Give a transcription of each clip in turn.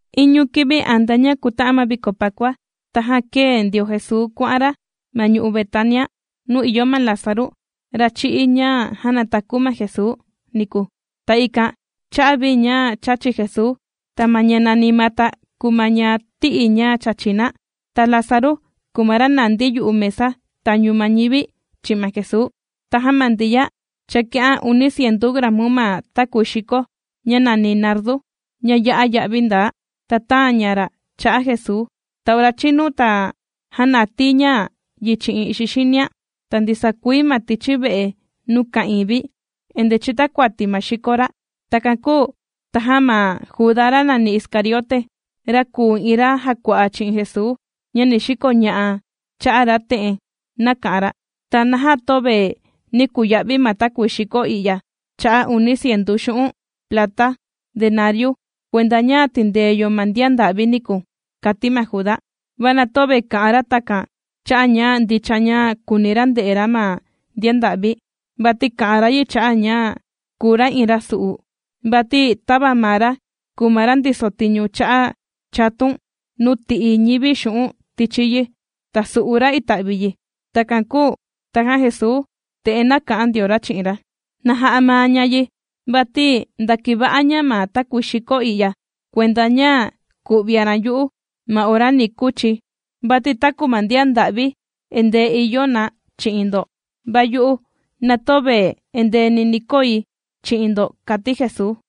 Iñu kivi antea ña kuta'an ma viko Pakua, tajan kēe ndio Jesuu kuà'an ra ma ñu'u' Betania, nuu ìyo ma Lázaru, ra chī'í, ña jānataku ma Jesuu, niku. Ta ikan chā'a vi ña chāchi Jesuu. Ta ma ña nàni Mata kùu ma ña tī'i ña chāchi na, ta Lázaru kùu ma ra nàndi yu'u mesa tañu ma ñivi chi'in ma Jesuu. Tajan ma Ndiya chāki'an uni cientu gramu ma takuii xiko ña nàni nardu, ña ya'a ya'vi ndaa. Ta tāan ña ra' cha'a Jesuu, ta ora chīnu, ta jānatii ña yi chi'in ixi xinian. Ta ndisaa kuii ma tichi ve'e nuu ka'ìin vi endee chìtakuati ma xiko ra'. Takan kūu tajan ma Judá, ra nàni Iscariote, ra kùu iin ra jàkua'a chi'in Jesuu ña ni xikoña'a cha'a ra, te'en nāka'an ra: ―¿Ta naja töve nī kuya'vi ma takuii xiko i'ya cha'a' uni cientu xu'un' plata denariu, kuenda ña tìndee yo ma ndian nda'vi niku? ―kàti ma Juda. Va na töve kā'an ra takan cha'a' ña ndicha ña kùuni ra nde'e ra ma ndian nda'vi, vati kā'an ra yi cha'a' ña kùu ra iin rasu'u. Vati tava maa ra kùu ma ra ndiso tiñu cha'a' chatun nuu tì'i ñivi xu'un' tichi yi, ta sù'u ra ita'vi yi. Takan kūu tajan Jesuu, te'en nāka'an ndio ra chi'in ra: ―Na ja'a maa ña yi, vati ndākiva'a ña ma takuii xiko i'ya kuenda ña ku'vian ra' yu'u ma ora ni kuchi̱. Vati taku ma ndian nda'vi endee ìyo na chi'in ndo, va yu'u, na töve endeeni ni koi chi'in ndo ―kàti Jesuu.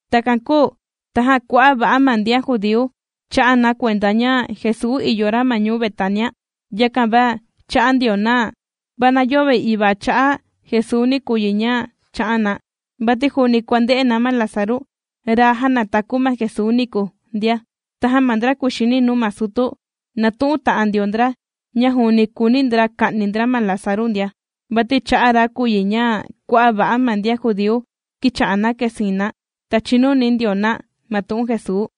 Takan kūu tajan kua'a' va'a ma ndian judíu chā'a na kuenda ña Jesuu ìyo ra ma ñuu Betania, yakan va chā'an ndio na, va na yöve ivaa cha'a' Jesuuni kùu yi ña chā'an na, vati juuni kuànde'e na ma Lázaru, ra jānataku ma Jesuu niku, ndia. Tajan ma ndra kuxini nuu ma sutu, nātu'un ta'an ndio ndra ña juuni kùuni ndra ka'ni ndra ma Lázaru ndia. Vati cha'a' ra kùu yi ña kua'a' va'a ma ndian judíu kīcha'a na kèsiin na, ta chìnuni ndio na ma tu'un Jesuu.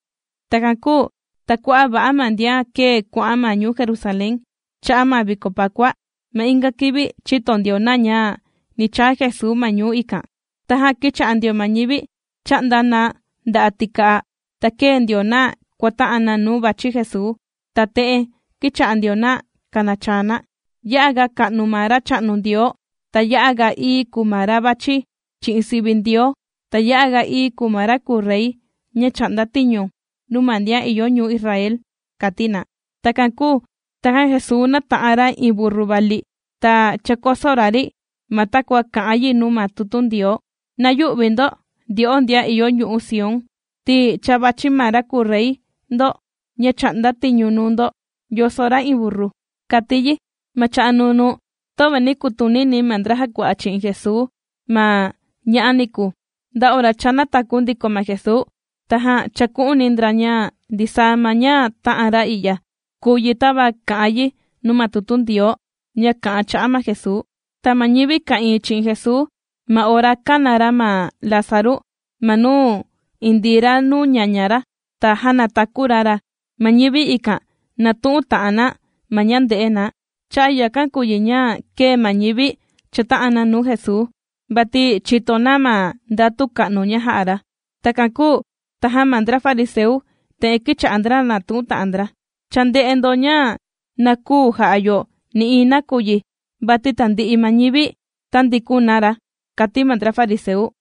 Takan kūu ta kua'a' va'a ma ndian kēe kuà'an ma ñuu Jerusalén cha'a' ma viko Pakua, ma inga kivi chīto ndio na ña ni chaa Jesuu ma ñuu ikan. Tajan kīcha'a ndio ma ñivi chà'nda na nda'a' tika'a, ta kēe ndio na kuàta'an na nuu vàchi Jesuu, ta te'en kīcha'a ndio na kànachaa na: ―¡Ya'a ga ka'nu ma Racha'nu Ndioo! ¡Ta ya'a ga ií kùu ma ra vàchi chi'in sivi Ndioo! ¡Ta ya'a ga ií kùu ma ra kuu rey ña chà'nda tiñu nuu ma ndian ìyo ñuu Israel! ―kàti na. Takan kūu tajan Jesuu nāta'an ra iin burru vali, ta chākoso ra ri, ma takua kà'an yi nuu ma tutu Ndioo: Na yü'vi ndo ndyo'o ndian ìyo ñu'u' Sión, ti cha vàchi ma ra kùu rey ndo ña chà'nda tiñu nuu ndo yòso ra iin burru, kàti yi. Ma cha'a' nunuu, töve nī kutunini ma ndra jàkua'a chi'in Jesuu ma ña'a niku, nda ora cha nātaku ndiko ma Jesuu, tajan chāku'uni ndra ña ndisaa ma ña tā'an ra i'ya, kūu yi tava kà'an yi nuu ma tutu Ndioo ña kà'an cha'a' ma Jesuu. Ta ma ñivi ka'ìin chi'in Jesuu ma ora kāna ra ma Lázaru ma nuu indii ra nuu ñaña ra ta jānataku ra ra, ma ñivi ikan nātu'un ta'an na ma ña ndē'e na. Cha'a' yakan kùu yi ña kēe ma ñivi chàta'an na nuu Jesuu, vati chīto na ma ndatu ka'nu ña jā'a ra. Takan kūu tajan ma ndra fariseu te'en kīcha'a ndra nàtu'un ta'an ndra: ―Cha ndē'e ndo ña na küu ja'a yo nï'iin nakuyi, vati tandi'i ma ñivi tāndikun na ra ―kàti ma ndra fariseu.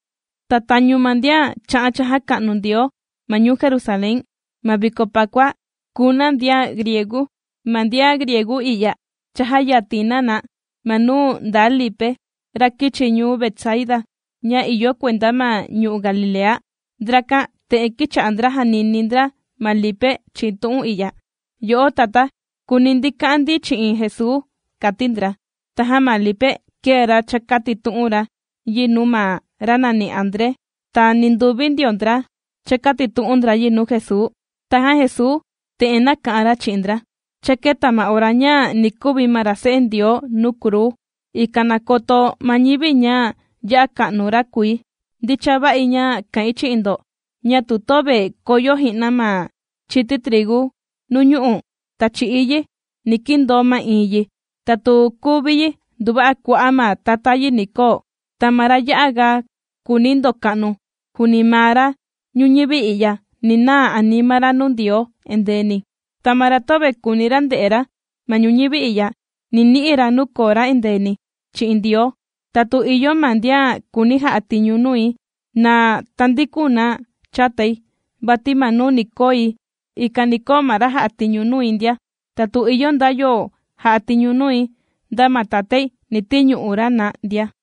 Ta tañu ma ndian chā'an chājaka'nu Ndioo ma ñuu Jerusalén ma viko Pakua kùu na ndian griegu. Ma ndian griegu i'ya chājayatin na na ma nuu ndaa Lipe, ra kīchi ñuu Betsaida, ña ìyo kuenda ma ñu'u' Galilea. Ndrakan te'en kīcha'a ndra jànini ndra ma Lipe chi'in tu'un i'ya: ―Yo'o tatá, kùuni ndi ka'an ndi chi'in Jesuu ―kàti ndra. Tajan ma Lipe kēe ra chākatitu'un ra yi nuu ma ra nàni André. Ta ninduvi ndio ndra chākatitu'un ndra yi nuu Jesuu. Tajan Jesuu te'en nāka'an ra chi'in ndra: ―Cha kēta ma ora ña ni kuvi ma ra Se'e Ndioo nuu kruu, ikan na koto ma ñivi ña ya'a ka'nu ra kùi. Ndicha va'i ña kà'in chi'in ndo ña tu töve koyo ji'na ma chiti trigu nuu ñu'u', ta chì'í yi, ni kindoo ma'iin yi; ta tu kuvi yi, nduva'a kua'a' ma tata yi ni koo. Ta ma ra ya'a ga kùuni ndoka'nu juuni maa ra ñuñivi i'ya, ni naa anima ra nuu Ndioo endeeni, ta ma ra töve kùuni ra nde'e ra ma ñuñivi i'ya, ni ni'i ra nuu koo ra endeeni chi'in Ndioo. Ta tu ìyo ma ndian kùuni ja'a tiñu nui, na tandikun na chatai, vati ma nuu ni koi, ikan ni koo ma ra jà'a tiñu nui ndia. Ta tu ìyo nda yo ja'a tiñu nui, nda ma Tatái ni tiñu'u ra na ndia.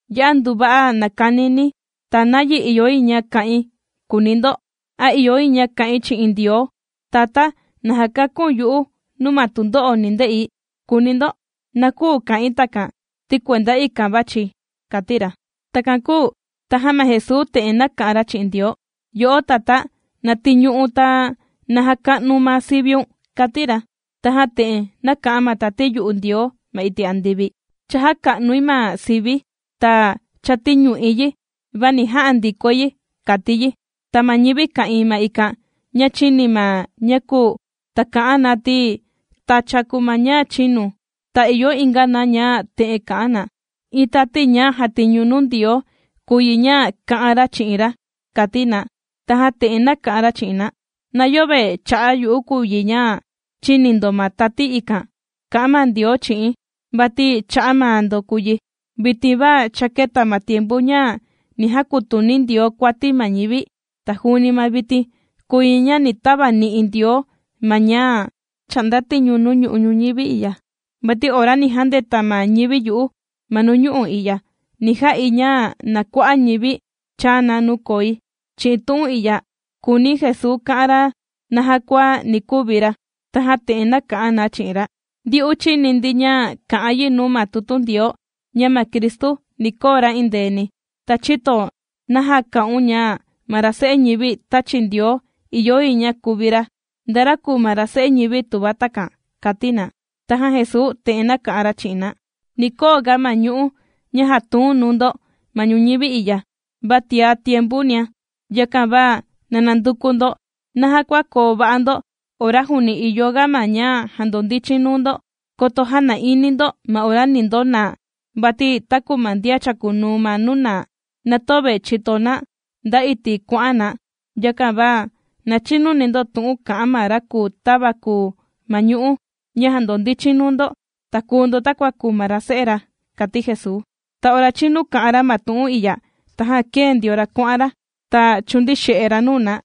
’¡Ya'a nduva'a nàkanini̱! ¿Ta nayi ìyo yi ña ka'in?, kùuni ndo. ¿A ìyo yi ña ka'in chi'in Ndioo: “Tatá na jakaku̱n yu'u nuu ma tundo'o ni nde'i”?, kùuni ndo. Na küu ka'in takan, ti kuenda ikan vàchi̱, ―kàti ra. Takan kūu tajan ma Jesuu te'en nāka'an ra chi'in Ndioo: ―Yo'o Tatá, na tiñu'u̱n ta na jaka'nu̱n ma siviun ―kàti ra. Tajan te'en nāka'an ma tati yu'u Ndioo ma iti' andivi: ―Cha jāka'nui ma sivi̱, ta cha tīñu'i yi, va ni ja'a ndikoi yi ―kàti yi. Ta ma ñivi ka'ìin ma ikan ña chīni ma ña kūu, ta ka'an na ti, tacha kùu ma ña chīnu, ta ìyo inga na ña, te'en kà'an na: ―Iin tati ña jà'a tiñu nuu Ndioo kùu yi ña kā'an ra chi'in ra ―kàti na. Tajan te'en nāka'an ra chi'in na: ―Na yöve cha'a' yu'u kùu yi ña chīni ndo ma tati ikan kā'an ma Ndioo chi'i̱n, vati cha'a' maa ndo kùu yi. Vitin va cha kēta ma tiempu ña ni jakutuni Ndioo kuati ma ñivi, ta juuni ma vitin kùu yi ña ni tavani'i Ndioo ma ñá' chà'nda tiñu nuu ñu'u' ñuñivi i'ya. Vati ora ni jandeta ma ñivi yu'u ma nuu ñu'u' i'ya, ni ja'i ña na kua'a' ñivi chaa na nuu koi. Chi'in tu'un i'ya kūuni Jesuu ka'an ra naja kua ni kuvi ra. Tajan te'en nāka'an na chi'in ra: ―Ndyu'u chīni ndi ña kà'an yi nuu ma tutu Ndioo ña ma Cristu ni koo ra indeeni. ¿Ta chïto naja kā'un ña ma ra Se'e Ñivi tāchi Ndioo ìyo yi ña kuvi ra? ¿Nda ra kùu ma ra Se'e Ñivi tuva takan? ―kàti na. Tajan Jesuu te'en nāka'an ra chi'in na: ―Ni koo ga ma ñu'ú ña jàtuun nuu ndo ma ñuñivi i'ya, va tia tiempunia. Yakan va na nanduku ndo naja kua koo va'a ndo ora juuni ìyo ga ma ña jandondichin nuu ndo. Koto jäna'ini ndo ma ora ni ndonaa. Vati taku ma ndian chàkunuu ma nuu naa, na töve chìto na nda iti' kuà'an na. Yakan va na chinuni ndo tu'un kà'an ma ra kùu tava kùu ma ñu'ú ña jàndondichin nuu ndo, ta kuu ndo takua kùu ma ra se'e ra ―kàti Jesuu. Ta ora chīnu kā'an ra ma tu'un i'ya, tajan kēe ndio ra kuà'an ra, ta chūndii xe'e ra nuu na.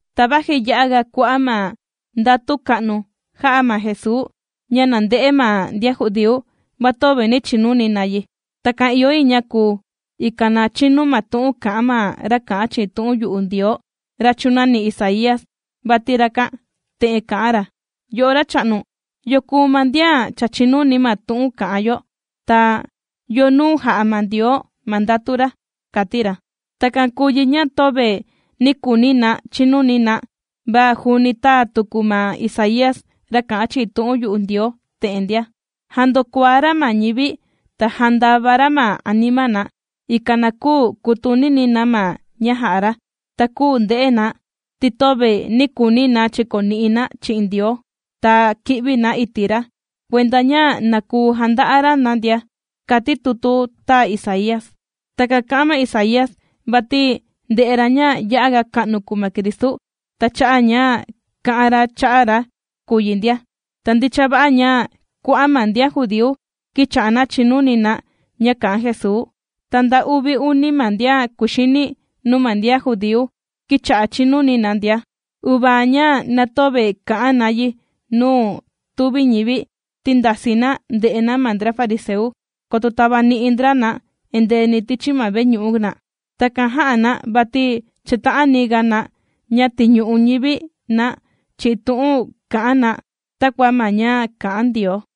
Ta vaji ya'aga kua'a' ma ndatu ka'nu jā'a ma Jesuu ña nànde'e ma ndian judíu, va töve nī chinuni na yi. Takan ìyo yi ña kuu, ikan na chinu ma tu'un kà'an ma ra kā'an chi'in tu'un yu'u Ndioo, ra chūnani Isaía, vati rakan te'en kā'an ra: Yo'o Racha'nu, ¿yo kùu ma ndian cha chìnuni ma tu'un kà'an yo? Ta, ¿Yo nuu jā'a ma Ndioo ma ndatu ra? kàti ra. Takan kūu yi ña töve nī kuuni na chinuni na, va juuni tāa tuku ma Isaía ra kà'an chi'in tu'un yu'u Ndioo te'en ndia: Jāndokuaá ra ma ñivi ta jāndava ra ma anima na, ikan na küu kutunini na ma ña jà'a ra, ta küu nde'e na, ti töve nī kuuni na chikoni'i na chi'in Ndioo ta ki'vi na iti' ra kuenda ña na kuu janda'a ra na ndia, kāti tutu tāa Isaía. Takan kā'an ma Isaía vati ndē'e ra ña ya'a ka'nu kùu ma Cristu, ta cha'a' ña kā'an ra cha'a' ra kùu yi ndia. Ta ndicha va'a ña kua'a' ma ndian judíu kīcha'a na chìnuni na ña kà'an Jesuu, ta nda uvi uni ma ndian kuxini nuu ma ndian judíu, kīcha'a chìnuni na ndia. Uvaa ña na töve kà'an na yi nuu tùvi ñivi, ti ndasii na nde'e na ma ndra fariseu, koto tavani'i ndra na endeeni tichi ma veñu'u na. Takan jā'a na vati chàta'ani ga na ña tiñu'u ñivi na chi'in tu'un kà'an na, takua ma ña kà'an Ndioo.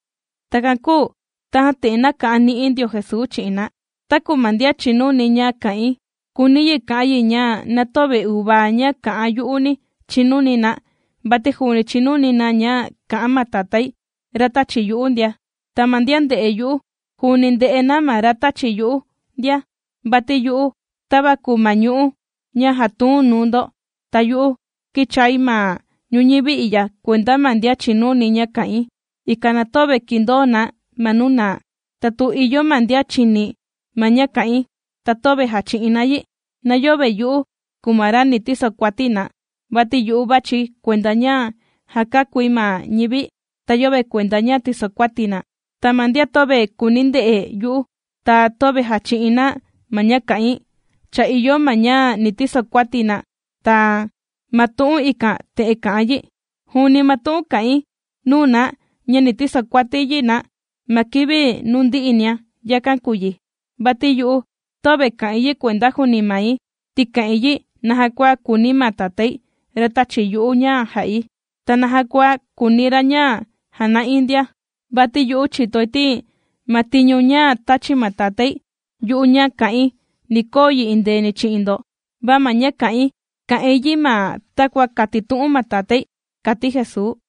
Takan kūu tajan te'en nāka'an ni'i ndio Jesuu chi'in na: ―Taku ma ndian chìnuni ña kà'in, kùuni yi ka'an yi ña na töve uvaa ña kà'an yu'uni chinuni na vati juuni chinuni na ña kà'an ma Tatái, ra tāchi yu'u ndia. Ta ma ndian ndè'e yu'u, juuni ndè'e na ma ra tāchi yu'u ndia. Vati yu'u kùi tava kùu ma ñu'ú ña jàtuun nuu ndo, ta yu'u kīchai ma ñuñivi i'ya kuenda ma ndian chìnuni ña kà'in, ikan na töve kindoo na ma nuu naa. Ta tu ìyo ma ndian chìni ma ña kà'in ta töve jàchi'in na yi, na yöve yu'u kùu ma ra ni tisokuati na, vati yu'u vàchi̱ kuenda ña jàkakúi ma ñivi, ta yöve kuenda ña tìsokuati̱ na. Ta ma ndian töve kùuni nde'e yu'u, ta töve jàchi'in na ma ña kà'in, cha ìyo ma ña ni tisokuati na, ta ma tu'un ikan te'en kà'an yi: juuni ma tu'un kà'in nuu na ña ni tisokuati yi na ma kivi nuu ndi'inia, yakan kùu yi. Vati yu'u töve kà'in yi kuenda juuni mai, ti kà'in yi naja kua kùuni ma Tatái, ra tāchi yu'u ña jà'i. Ta naja kua kùuni ra ña jana'i ndia. Vati yu'u chìtoi ti ma tiñu ña tāchi ma Tatái yu'u ña na ka'in, ni ja'a yi ña na koo ndo endeeni. Va ma ña kà'in, kà'in yi ma takua kātitu'un ma Tatái ―kàti Jesuu.